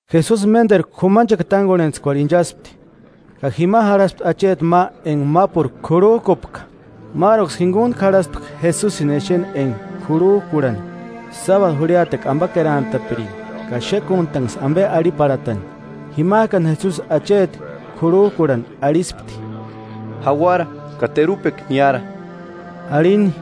Jesusi ménderu k'umanchekua tángorhentskuarhu inchaspti, ka jima jarhaspti acheti ma enga mápuru k'urhujkupka. Máruksï jinguntku jarhaspti Jesusini exeni enga k'urhujkurhani sábadu jurhiatekua ambakerantapiringa, ka xékuntanksï ambe arhiparhatani. Jimajkani Jesusi acheti k'urhujkurhani arhispti: –Jauara ka terupekua niára. Arhini.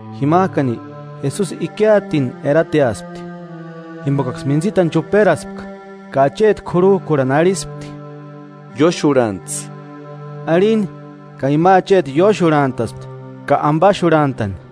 Jimajkani, Jesusi ikiatini erateaspti, jimbokaksï mintsitani chuperaspka, ka acheti k'urhujkurhani arhispti: –Ióxurhantsï. Arhini. Ka ima acheti ióxurhantaspti ka ambaxurhantani.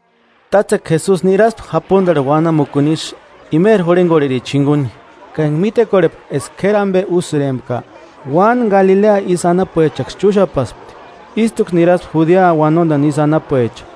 Tátsekua Jesusi niraspti japundarhu uanamukuni isï imeri jurhengorhericha jinguni, ka enga mítekorhepka eska k'éri ambe úsïrempka, uáni Galilea isï anapuechaksï chúxapaspti, ístuksï niraspti Judea uanondani isï anapuecha,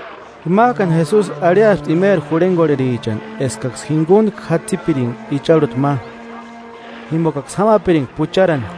Jimajkani Jesusi arhiaspti imeri jurhengorherichani eskaksï jinguntku jatsipiringa icharhuta ma, jimbokaksï jámapiringa pucharani,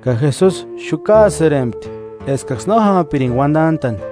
Ka Jesusi xukaasïrempti eskaksï no jámapiringa uandantani.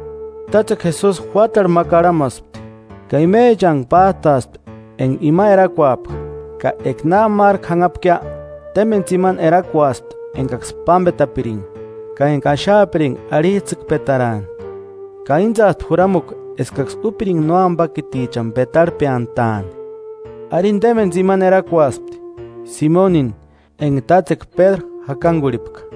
Tátsekua Jesusi juátarhu ma karhamaspti, ka imechantku pájtaaspti enga ima erakuapka. Ka eka na márku janhapkia témbeni tsimani erakuaspti engaksï pámbetapiringa ka enga axaapiringa arhijtsïkpetaraani. Ka íntsaaspti juramukua eskaksï úpiringa nóambakitichani petarhpeantaani. Arini témbeni tsimani erakuaspti: Simonini, enga tátsekua Pédru jakangurhipka;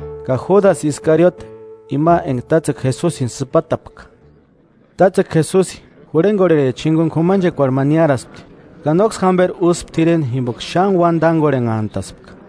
ka Júdasï Iskarioti, ima enga tátsekua Jesusini sïpatapka. Tátsekua Jesusi jurhengorhericha jinguni k'umanchekuarhu ma niáraspti. Ka nóksï jamberi úspti t'ireni jimboka xáni uáni tángorhenhantaspka.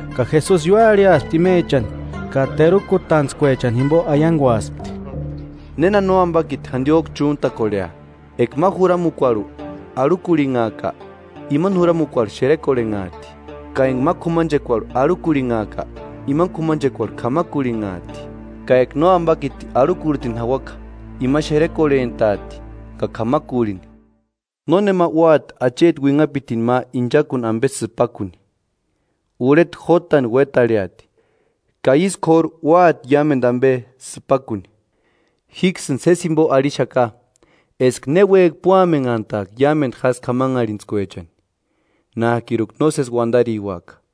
Ka Jesusi ióarhiaspti imechani, ka terukutantskuechani jimbo aianguaspti: “¿Néna Nóambakiti jandiojku chúntakorhea? Eka ma juramukuarhu arhukurhinhaaka, imani juramukuarhu xerekorhenhaati. Ka enga ma k'umanchekuarhu arhukurhinhaaka, imani k'umanchekuarhu k'amakurhinhaati. Ka eka Nóambakiti arhukurhitini jauaka, ima xerekorhentaati ka k'amakurhini.” “Nónema úati acheti uinhapitini ma inchakuni ambe sïpakuni, urheta jótani uétarheati ka ísï k'óru úati iámendu ambe sïpakuni.” “Jíksïni sési jimbo arhixaka eska ne uéjki púamenhantaaka iámendu jásï k'amanharhintskuechani, nájkiruka nósesi uandariuaka.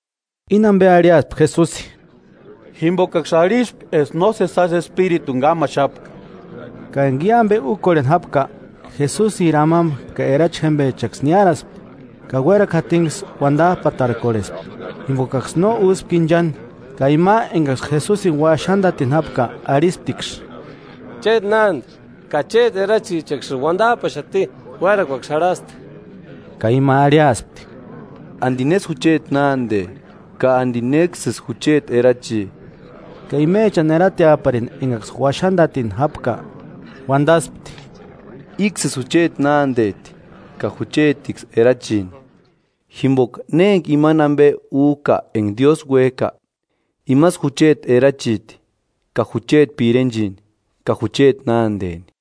Íni ambe arhiaspti Jesusi, jimbokaksï arhispka eska nósesi jásï espirituni kámaxapka. Ka enga i ambe úkorheni jápka, Jesusiri amamba ka erachi jémbechaksï niáraspti, ka uérakua jatiniksï uandajpatarkorhespti, jimbokaksï no úspka inchani. Ka ima engaksï Jesusini uaxandatini jápka, arhistiksï: –Chéti nánde, ka chéti erachichaksïni uandajpaxati, uérakuaksï jarhasti. Ka ima arhiaspti: –¿Andi nésï jucheti nánde, ka andi néksïsï jucheti erachi? Ka imechani erateaparini engaksï uaxandatini jápka, uandaspti: –Íksïsï jucheti nándeti ka juchetiksï erachini. Jimboka ne enga imani ambe újka enga Diósï uéjka, imasï jucheti erachiti ka jucheti pirenchini ka jucheti nándeni.